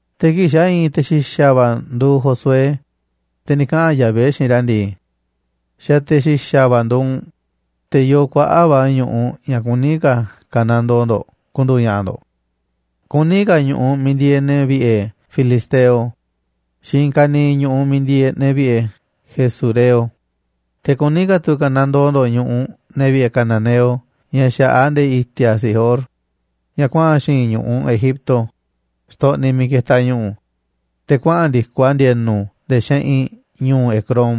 Te̱ kii̱ꞌ xa̱ i̱i̱n te̱ xi̱xa̱ va̱ nduuꞌ Josué, te̱ ni̱ kaꞌa̱n Yahvé xiinꞌ ra̱ ndii: ―Xa̱ te̱ xi̱xa̱ va̱ nduuꞌ u̱nꞌ, te̱ yoo kuaꞌa̱ꞌ va̱ ñu̱ꞌuꞌ ña̱ kuní ka̱ ka̱nandoo ndo̱ꞌ ku̱ndu̱u̱ ña̱ꞌa̱ ndo̱ꞌ. Kuní ka̱ ñu̱ꞌuꞌ miiꞌ ndieeꞌ ne̱ vi̱ꞌe̱ filisteo, xiinꞌ i̱i̱n ka̱niiꞌ ñu̱ꞌuꞌ miiꞌ ndieeꞌ ne̱ vi̱ꞌe̱ gesureo, te̱ kuní ka̱ tu̱ ka̱nandoo ndo̱ꞌ ñu̱ꞌuꞌ ne̱ vi̱ꞌe̱ cananeo ña̱ xa̱ꞌaꞌ a̱ nde̱e̱ i̱ti̱a̱ Sihor ña̱ kuaꞌa̱n xi̱i̱nꞌ ñu̱ꞌuꞌ Egipto, xtoꞌniꞌ miiꞌ ketaꞌ ñu̱ꞌu̱, te̱ kuaꞌa̱n ndi̱koꞌ a̱ ndi̱e̱nu̱ nde̱e̱ xeꞌinꞌ ñu̱u̱ Ecrón.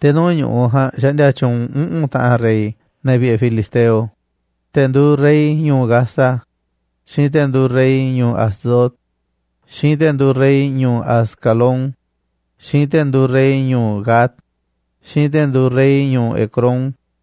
Te̱ nuu̱ꞌ ñu̱ꞌuꞌ ja̱a̱nꞌ xaꞌndia tyuunꞌ uꞌu̱n taꞌan rey ne̱ vi̱ꞌe̱ filisteo, te̱ nduuꞌ rey ñu̱u̱ Gaza, xiinꞌ te̱ nduuꞌ rey ñu̱u̱ Asdod, xiinꞌ te̱ nduuꞌ rey ñu̱u̱ Ascalón, xiinꞌ te̱ nduuꞌ rey ñu̱u̱ Gat, xiinꞌ te̱ nduuꞌ rey ñu̱u̱ Ecrón.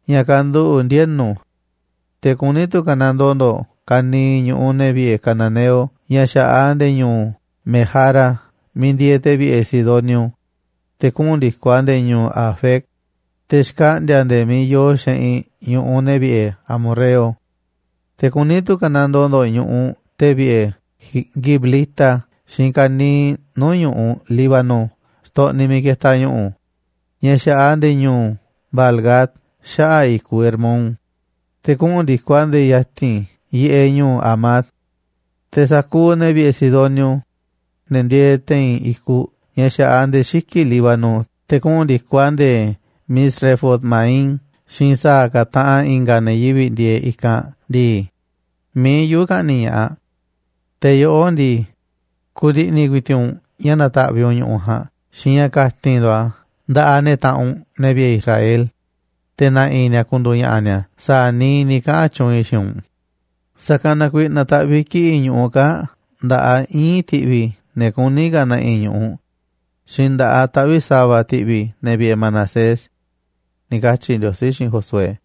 ña̱ kanduꞌu̱ꞌ ndienu̱. Te̱ kuní tu̱ ka̱nandoo ndo̱ꞌ ka̱niiꞌ ñu̱ꞌuꞌ ne̱ vi̱ꞌe̱ cananeo ña̱ xa̱ꞌaꞌ a̱ nde̱e̱ ñu̱u̱ Mehara miiꞌ ndieeꞌ ne̱ vi̱ꞌe̱ sidonio, te̱ kuꞌu̱n ndi̱koꞌ a̱ nde̱e̱ ñu̱u̱ Afec, te̱ xkaꞌndi̱a̱ a̱ nde̱e̱ miiꞌ yoo xeꞌinꞌ ñu̱ꞌuꞌ ne̱ vi̱ꞌe̱ amorreo. Te̱ kuní tu̱ ka̱nandoo ndo̱ꞌ ñu̱ꞌuꞌ te̱ vi̱ꞌe̱ giblita xiinꞌ ka̱niiꞌ nuu̱ꞌ ñu̱ꞌuꞌ Líbano xtoꞌniꞌ miiꞌ ketaꞌ ñu̱ꞌu̱ ña̱ xa̱ꞌaꞌ a̱ nde̱e̱ ñu̱u̱ Baal-gad xaꞌa̱ꞌ i̱kuꞌ Hermón, te̱ kuꞌu̱n ndi̱koꞌ a̱ nde̱e̱ ya̱ti̱n yiꞌeꞌ ñu̱u̱ Hamat. Te̱ sa̱kuuꞌ ne̱ vi̱ꞌe̱ Sidonio, ne̱ ndieeꞌ te̱i̱n i̱kuꞌ ña̱ xa̱ꞌaꞌ a̱ nde̱e̱ xiki̱ꞌ Líbano te̱ kuꞌu̱n ndi̱koꞌ a̱ nde̱e̱ Misrefotmaim xiinꞌ sa̱a̱ ka̱ taꞌan i̱nga̱ ne̱ yivi̱ꞌ ndieeꞌ i̱kanꞌ ndii, mi̱iꞌ yuꞌu̱ ka̱ꞌni̱ꞌ ña̱ꞌaꞌ. Te̱ yoꞌó ndii, ku̱ndi̱ꞌni̱ ku̱i̱ti̱ꞌ u̱nꞌ ña̱ na̱ta̱ꞌviꞌ u̱nꞌ ñu̱ꞌuꞌ ja̱a̱nꞌ xiinꞌ ña̱ kati̱n ndo̱ꞌ a̱ nda̱ꞌaꞌ ne̱ taꞌanꞌ u̱nꞌ, ne̱ vi̱ꞌe̱ Israel, te̱ na̱ꞌi̱ ni̱a̱ a̱ ku̱ndu̱u̱ ña̱ꞌa̱ ni̱a̱ sa̱a̱ niiꞌ ni̱ kaꞌa̱n tyuunꞌ i̱ xiinꞌ u̱nꞌ. Sa̱kanꞌ na kuiiꞌ na̱ta̱ꞌviꞌ kiꞌi̱ꞌ ñu̱ꞌuꞌ kaa̱ꞌ nda̱ꞌaꞌ íin ti̱ꞌvi̱ ne̱ kuní ka̱ na̱ꞌi̱ ñu̱ꞌuꞌ, xiinꞌ nda̱ꞌaꞌ taꞌvi̱ꞌ sa̱va̱ ti̱ꞌvi̱ ne̱ vi̱ꞌe̱ Manasés ―ni̱ katyi̱ Ndiosí xiinꞌ Josué.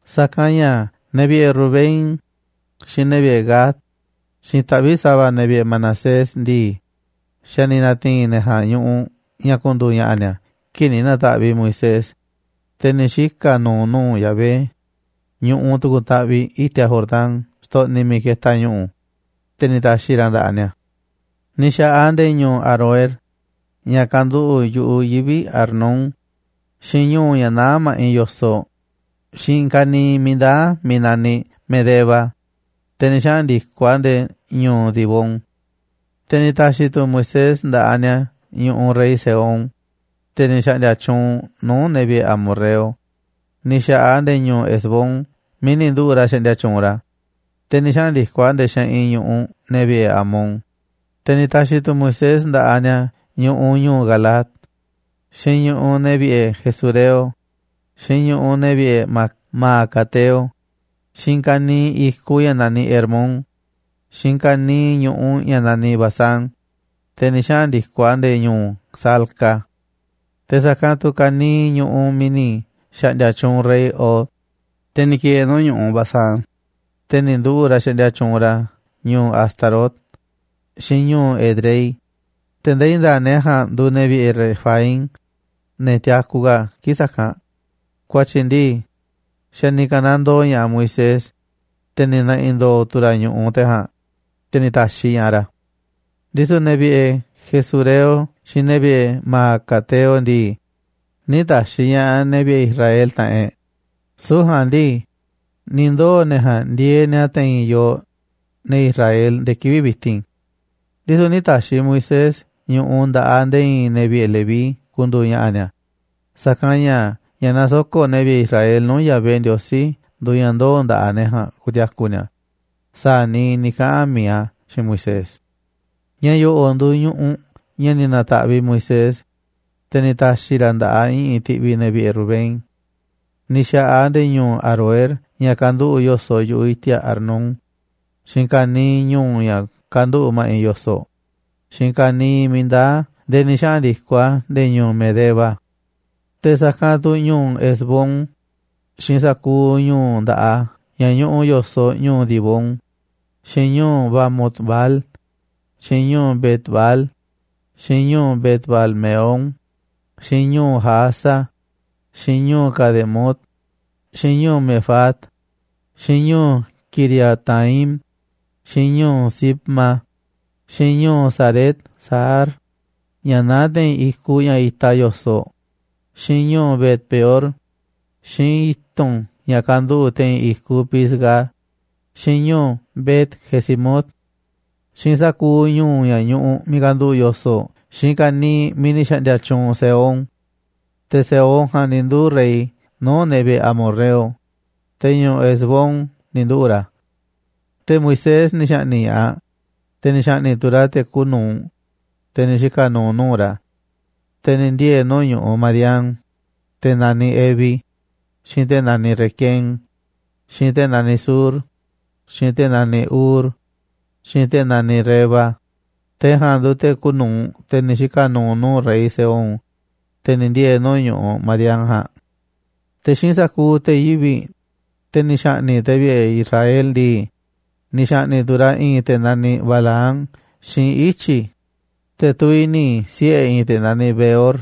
Sa̱kanꞌ ña̱ ne̱ vi̱ꞌe̱ Rubén, xiinꞌ ne̱ vi̱ꞌe̱ Gad, xiinꞌ taꞌvi̱ꞌ sa̱va̱ ne̱ vi̱ꞌe̱ Manasés ndii, xa̱ ni̱ na̱ti̱i̱n ne̱ ja̱a̱nꞌ ñu̱ꞌuꞌ ña̱ ku̱ndu̱u̱ ña̱ꞌa̱ ni̱a̱ kii̱ꞌ ni̱ na̱ta̱ꞌviꞌ Moisés, te̱ ni̱ xika̱ nu̱u̱ nuu̱ꞌ Yahvé, ñu̱ꞌuꞌ tu̱ku̱ taꞌviꞌ i̱ti̱a̱ Jordán xtoꞌniꞌ miiꞌ ketaꞌ ñu̱ꞌu̱, te̱ ni̱ ta̱xi̱ ra̱ a̱ nda̱ꞌaꞌ ni̱a̱. Ni̱ xa̱ꞌaꞌ a̱ nde̱e̱ ñu̱u̱ Aroer, ña̱ kanduꞌu̱ꞌ yu̱ꞌuꞌ yivi̱ Arnón, xiinꞌ ñu̱u̱ ña̱ naá ma̱ꞌiꞌ yo̱soꞌ, xiinꞌ i̱i̱n ka̱niiꞌ miiꞌ ndaa̱ miiꞌ naniꞌ Medeba, te̱ ni̱ xaꞌa̱n ndi̱koꞌ a̱ nde̱e̱ ñu̱u̱ Dibón. Te̱ ni̱ ta̱xi̱ tu̱ Moisés nda̱ꞌaꞌ ni̱a̱ ñu̱ꞌuꞌ rey Sehón, te̱ ni̱ xa̱ꞌndi̱a̱ tyuunꞌ nuu̱ꞌ ne̱ vi̱ꞌe̱ amorreo, ni̱ xa̱ꞌaꞌ a̱ nde̱e̱ ñu̱u̱ Hesbón miiꞌ ni̱ nduꞌu̱ꞌ ra̱ xaꞌndia tyuunꞌ ra̱, te̱ ni̱ xaꞌa̱n ndi̱koꞌ a̱ nde̱e̱ xaꞌinꞌ ñu̱ꞌuꞌ ne̱ vi̱ꞌe̱ Amón. Te̱ ni̱ ta̱xi̱ tu̱ Moisés nda̱ꞌaꞌ ni̱a̱ ñu̱ꞌuꞌ ñu̱u̱ Galaad, xiinꞌ ñu̱ꞌuꞌ ne̱ vi̱ꞌe̱ gesureo, xiinꞌ ñu̱ꞌuꞌ ne̱ vi̱ꞌe̱ maacateo, xiinꞌ ka̱niiꞌ i̱kuꞌ ña̱ naniꞌ Hermón, xiinꞌ ka̱niiꞌ ñu̱ꞌuꞌ ña̱ naniꞌ Basán, te̱ ni̱ xaꞌa̱n ndi̱koꞌ a̱ nde̱e̱ ñu̱u̱ Salca. Te̱ sa̱kanꞌ tu̱ ka̱niiꞌ ñu̱ꞌuꞌ miiꞌ ni̱ xa̱ꞌndi̱a̱ tyuunꞌ rey Og, te̱ ni̱ ki̱e̱e̱ nuu̱ꞌ ñu̱ꞌuꞌ Basán, te̱ ni̱ nduꞌu̱ꞌ ra̱ xaꞌndia tyuunꞌ ra̱ ñu̱u̱ Astarot, xiinꞌ ñu̱u̱ Edrei, te̱ ndee i̱i̱n nda̱a̱ꞌ ne̱ ja̱a̱nꞌ nduuꞌ ne̱ vi̱ꞌe̱ Refaim, te̱ tiaku ka̱ kii̱ꞌ sa̱kanꞌ, ku̱a̱tyi̱ ndii, xa̱ ni̱ ka̱nandoo ña̱ꞌaꞌ Moisés, te̱ ni̱ na̱ꞌi̱ ndo̱o̱ tu̱ ra̱ ñu̱ꞌuꞌ te̱ ja̱a̱nꞌ, te̱ ni̱ ta̱xiꞌ ña̱ꞌaꞌ ra̱. Ndisu̱ ne̱ vi̱ꞌe̱ gesureo xiinꞌ ne̱ vi̱ꞌe̱ maacateo ndii, nï̱ ta̱xiꞌ ña̱ꞌaꞌ ne̱ vi̱ꞌe̱ Israel, taꞌanꞌ i̱, süu̱ꞌ ja̱a̱nꞌ ndii, ni̱ ndoo̱ ne̱ ja̱a̱nꞌ ndieeꞌ ni̱a̱ te̱i̱n yooꞌ, ne̱ Israel, nde̱e̱ kivi̱ꞌ vi̱ti̱n. Ndisu̱ nï̱ ta̱xi̱ Moisés ñu̱ꞌuꞌ nda̱ꞌaꞌ nde̱e̱ i̱i̱n ne̱ vi̱ꞌe̱ Leví ku̱ndu̱u̱ ña̱ꞌaꞌ ni̱a̱, sa̱kanꞌ ña̱ ña̱ nasoko̱ꞌ ne̱ vi̱ꞌe̱ Israel nuu̱ꞌ Yahvé Ndiosí nduuꞌ ña̱ ndoo̱ nda̱ꞌaꞌ ne̱ ja̱a̱nꞌ ku̱ti̱a̱ku̱ ni̱a̱, sa̱a̱ niiꞌ ni̱ kaꞌa̱n mi̱iꞌ a̱ xiinꞌ Moisés. Ña̱ yo̱ꞌo̱ꞌ nduuꞌ ñu̱ꞌuꞌ ña̱ ni̱ na̱ta̱ꞌviꞌ Moisés, te̱ ni̱ ta̱xi̱ ra̱ a̱ nda̱ꞌaꞌ i̱ꞌi̱n ti̱ꞌvi̱ ne̱ vi̱ꞌe̱ Rubén. Ni̱ xa̱ꞌaꞌ a̱ nde̱e̱ ñu̱u̱ Aroer, ña̱ kanduꞌu̱ꞌ yo̱soꞌ yu̱ꞌuꞌ i̱ti̱a̱ Arnón, xiinꞌ ka̱niiꞌ ñu̱u̱ ña̱ kanduꞌu̱ꞌ ma̱ꞌiꞌ yo̱soꞌ, xiinꞌ ka̱niiꞌ miiꞌ ndaa̱ nde̱e̱ ni̱ xaꞌa̱n ndi̱koꞌ a̱ nde̱e̱ ñu̱u̱ Medeba. Te̱ sa̱kanꞌ tu̱ ñu̱u̱ Hesbón, xiinꞌ sa̱kuuꞌ ñu̱u̱ nda̱ꞌaꞌ a̱ ña̱ ñuꞌuꞌ yo̱soꞌ ñu̱u̱ Dibón, xiinꞌ ñu̱u̱ Bamot-baal, xiinꞌ ñu̱u̱ Bet-baal-meón, xiinꞌ ñu̱u̱ Jahaza, xiinꞌ ñu̱u̱ Cademot, xiinꞌ ñu̱u̱ Mefaat, xiinꞌ ñu̱u̱ Quiriataim, xiinꞌ ñu̱u̱ Sibma, xiinꞌ ñu̱u̱ Zaret-sahar ña̱ naá te̱i̱n i̱kuꞌ ña̱ itaꞌ yo̱soꞌ, xiinꞌ ñu̱u̱ Bet-peor, xiinꞌ i̱tu̱n ña̱ kanduꞌu̱ꞌ te̱i̱n i̱kuꞌ Pisga, xiinꞌ ñu̱u̱ Bet-jesimot. Xiinꞌ sa̱kuuꞌ ñu̱u̱ ña̱ ñuꞌuꞌ miiꞌ kanduꞌu̱ꞌ yo̱soꞌ xiinꞌ ka̱niiꞌ miiꞌ ni̱ xa̱ꞌndi̱a̱ tyuunꞌ Sehón. Te̱ Sehón ja̱a̱nꞌ ni̱ nduu̱ rey nuu̱ꞌ ne̱ vi̱ꞌe̱ amorreo, te̱ ñu̱u̱ Hesbón ni̱ nduꞌu̱ꞌ ra̱. Te̱ Moisés ni̱ xa̱ꞌni̱ꞌ ña̱ꞌaꞌ, te̱ ni̱ xa̱ꞌni̱ꞌ tu̱ ra̱ te̱ kuuꞌ nu̱uꞌ, te̱ ni̱ xika̱ nu̱u̱ nuu̱ꞌ ra̱, te̱ ni̱ ndiee̱ nuu̱ꞌ ñu̱ꞌuꞌ Madián, te̱ naniꞌ Evi, xiinꞌ te̱ naniꞌ Requem, xiinꞌ te̱ naniꞌ Zur, xiinꞌ te̱ naniꞌ Hur, xiinꞌ te̱ naniꞌ Reba. Te̱ ja̱a̱nꞌ nduuꞌ te̱ kuuꞌ nu̱uꞌ, te̱ ni̱ xika̱ nu̱u̱ nuu̱ꞌ rey Sehón, te̱ ni̱ ndiee̱ nuu̱ꞌ ñu̱ꞌuꞌ Madián ja̱a̱nꞌ. Te̱ xiinꞌ sa̱kuuꞌ te̱ yivi̱ꞌ, te̱ ni̱ xa̱ꞌni̱ꞌ te̱ vi̱ꞌe̱ Israel ndii, ni̱ xa̱ꞌni̱ꞌ tu̱ ra̱ i̱i̱n te̱ naniꞌ Balaam xiinꞌ ityi̱, te̱ tuviꞌ i̱ni̱, siꞌe̱ i̱i̱n te̱ naniꞌ Beor.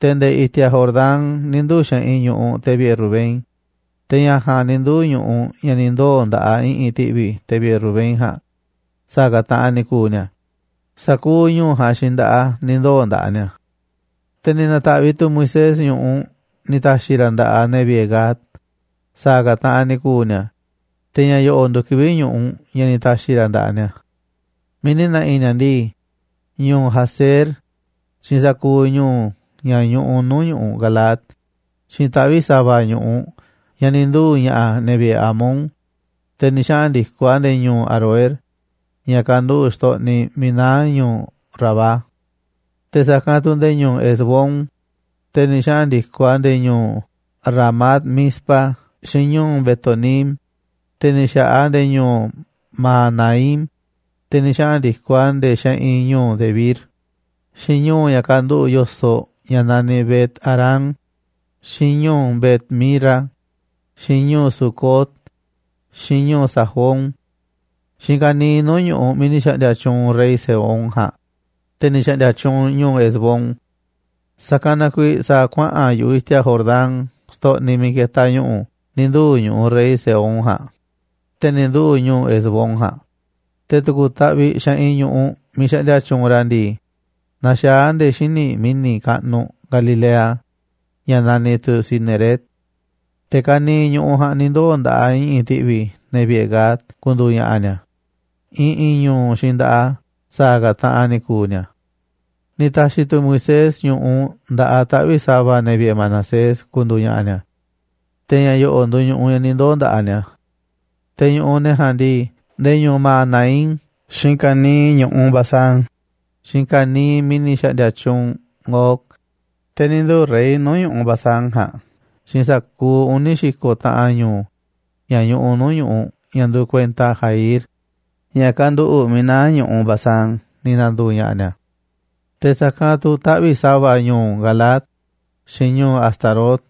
Te̱ nde̱e̱ i̱ti̱a̱ Jordán ni̱ nduu̱ xeꞌinꞌ ñu̱ꞌuꞌ te̱ vi̱ꞌe̱ Rubén, te̱ ña̱ ja̱a̱nꞌ ni̱ nduu̱ ñu̱ꞌuꞌ ña̱ ni̱ ndoo̱ nda̱ꞌaꞌ i̱ꞌi̱n ti̱ꞌvi̱ te̱ vi̱ꞌe̱ Rubén ja̱a̱nꞌ, sa̱a̱ ka̱ taꞌan ni̱ ku̱u̱ ni̱a̱, sa̱kuuꞌ ñu̱u̱ ja̱a̱nꞌ xiinꞌ nda̱ꞌaꞌ a̱ ni̱ ndoo̱ nda̱ꞌaꞌ ni̱a̱. Te̱ ni̱ na̱ta̱ꞌviꞌ tu̱ Moisés ñu̱ꞌuꞌ ni̱ ta̱xi̱ ra̱ nda̱ꞌaꞌ ne̱ vi̱ꞌe̱ Gad sa̱a̱ ka̱ taꞌan ni̱ ku̱u̱ ni̱a̱, te̱ ña̱ yo̱ꞌo̱ꞌ nduuꞌ kivi̱ꞌ ñu̱ꞌuꞌ ña̱ ni̱ ta̱xi̱ ra̱ nda̱ꞌaꞌ ni̱a̱. Miiꞌ ni̱ na̱ꞌi̱ ni̱a̱ ndii, ñu̱u̱ Jazer, xiinꞌ sa̱kuuꞌ ñu̱u̱ ña̱ ñuꞌuꞌ nuu̱ꞌ ñu̱ꞌuꞌ Galaad, xiinꞌ taꞌvi̱ꞌ sa̱va̱ ñu̱ꞌuꞌ ña̱ ni̱ nduu̱ ña̱ꞌa̱ ne̱ vi̱ꞌe̱ Amón, te̱ ni̱ xaꞌa̱n ndi̱koꞌ a̱ nde̱e̱ ñu̱u̱ Aroer, ña̱ kanduꞌu̱ꞌ xtoꞌniꞌ miiꞌ naá ñu̱u̱ Rabá. Te̱ sa̱kanꞌ tu̱ nde̱e̱ ñu̱u̱ Hesbón, te̱ ni̱ xaꞌa̱n ndi̱koꞌ a̱ nde̱e̱ ñu̱u̱ Ramat-mizpa xiinꞌ ñu̱u̱ Betonim, te̱ ni̱ xa̱ꞌaꞌ a̱ nde̱e̱ ñu̱u̱ Mahanaim, te̱ ni̱ xaꞌa̱n ndi̱koꞌ a̱ nde̱e̱ xaꞌinꞌ ñu̱u̱ Debir, xiinꞌ ñu̱u̱ ña̱ kanduꞌu̱ꞌ yo̱soꞌ ña̱ naniꞌ Bet-aram, xiinꞌ ñu̱u̱ Bet-nimra, xiinꞌ ñu̱u̱ Sucot, xiinꞌ ñu̱u̱ Zafón, xiinꞌ ka̱niiꞌ nuu̱ꞌ ñu̱ꞌuꞌ miiꞌ ni̱ xa̱ꞌndi̱a̱ tyuunꞌ rey Sehón ja̱a̱nꞌ, te̱ ni̱ xa̱ꞌndi̱a̱ tyuunꞌ ñu̱u̱ Hesbón. Sa̱kanꞌ na kuiiꞌ sa̱a̱ kuaꞌa̱n yu̱ꞌuꞌ i̱ti̱a̱ Jordán xtoꞌniꞌ miiꞌ ketaꞌ ñu̱ꞌu̱ ni̱ nduu̱ ñu̱ꞌuꞌ rey Sehón ja̱a̱nꞌ, te̱ ni̱ nduꞌu̱ꞌ ñu̱u̱ Hesbón ja̱a̱nꞌ, te̱ tu̱ku̱ taꞌviꞌ xeꞌinꞌ ñu̱ꞌuꞌ miiꞌ xaꞌndia tyuunꞌ ra̱ ndii, naxaá a̱ nde̱e̱ xíniꞌ mi̱ni̱ kaꞌnuꞌ Galilea, ña̱ naniꞌ tu̱ Cineret. Te̱ ka̱niiꞌ ñu̱ꞌuꞌ ja̱a̱nꞌ ni̱ ndoo̱ nda̱ꞌaꞌ i̱ꞌi̱n ti̱ꞌvi̱ ne̱ vi̱ꞌe̱ Gad ku̱ndu̱u̱ ña̱ꞌa̱ ni̱a̱, i̱ꞌi̱n ñu̱u̱ xiinꞌ nda̱ꞌaꞌ a̱ sa̱a̱ ka̱ taꞌan ni̱ ku̱u̱ ni̱a̱. Ni̱ ta̱xi̱ tu̱ Moisés ñu̱ꞌuꞌ nda̱ꞌaꞌ taꞌvi̱ꞌ sa̱va̱ ne̱ vi̱ꞌe̱ Manasés ku̱ndu̱u̱ ña̱ꞌa̱ ni̱a̱, te̱ ña̱ yo̱ꞌo̱ꞌ nduuꞌ ñu̱ꞌuꞌ ña̱ ni̱ ndoo̱ nda̱ꞌaꞌ ni̱a̱. Te̱ ñu̱ꞌuꞌ ne̱ ja̱a̱nꞌ ndii, nde̱e̱ ñu̱u̱ Mahanaim xiinꞌ ka̱niiꞌ ñu̱ꞌuꞌ Basán, xiinꞌ ka̱niiꞌ miiꞌ ni̱ xa̱ꞌndi̱a̱ tyuunꞌ Og, te̱ ni̱ nduu̱ rey nuu̱ꞌ ñu̱ꞌuꞌ Basán ja̱a̱nꞌ xiinꞌ sa̱kuuꞌ uni̱ xi̱ko̱ taꞌan ñu̱u̱, ña̱ ñuꞌuꞌ nuu̱ꞌ ñu̱ꞌuꞌ ña̱ nduuꞌ kuenta Jair, ña̱ kanduꞌu̱ꞌ miiꞌ naá ñu̱ꞌuꞌ Basán ni̱ na̱ndu̱u̱ ña̱ꞌa̱ ni̱a̱. Te̱ sa̱kanꞌ tu̱ taꞌvi̱ꞌ sa̱va̱ ñu̱u̱ Galaad, xiinꞌ ñu̱u̱ Astarot,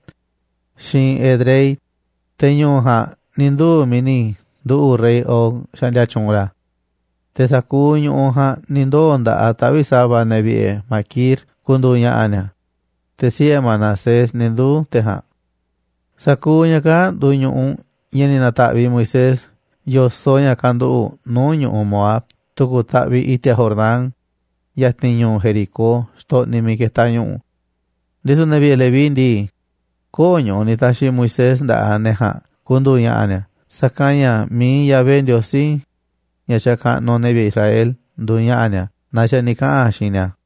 xiinꞌ Edrei, te̱ ñu̱u̱ ja̱a̱nꞌ ni̱ nduu̱ miiꞌ ni̱ nduꞌu̱ꞌ rey Og xaꞌndia tyuunꞌ ra̱. Te̱ sa̱kuuꞌ ñu̱ꞌuꞌ ja̱a̱nꞌ ni̱ ndoo̱ nda̱ꞌaꞌ taꞌvi̱ꞌ sa̱va̱ ne̱ vi̱ꞌe̱ Maquir ku̱ndu̱u̱ ña̱ꞌa̱ ni̱a̱, te̱ siꞌe̱ Manasés ni̱ nduu̱ te̱ ja̱a̱nꞌ. Sa̱kuuꞌ ña̱ kaa̱ꞌ nduuꞌ ñu̱ꞌuꞌ ña̱ ni̱ na̱ta̱ꞌviꞌ Moisés yo̱soꞌ ña̱ kanduꞌu̱ꞌ nuu̱ꞌ ñu̱ꞌuꞌ Moab tu̱ku̱ taꞌviꞌ i̱ti̱a̱ Jordán ya̱ti̱n ñu̱u̱ Jericó xtoꞌniꞌ miiꞌ ketaꞌ ñu̱ꞌu̱. Ndisu̱ ne̱ vi̱ꞌe̱ Leví ndii, köo̱ꞌ ñu̱ꞌuꞌ ni̱ ta̱xi̱ Moisés nda̱ꞌaꞌ ne̱ ja̱a̱nꞌ ku̱ndu̱u̱ ña̱ꞌa̱ ni̱a̱, sa̱kanꞌ ña̱ mi̱iꞌ Yahvé, Ndiosí ña̱ xakaꞌnuꞌ ne̱ vi̱ꞌe̱ Israel, nduuꞌ ña̱ꞌa̱ ni̱a̱ naa xa̱ ni̱ kaꞌa̱n a̱ xiinꞌ ni̱a̱.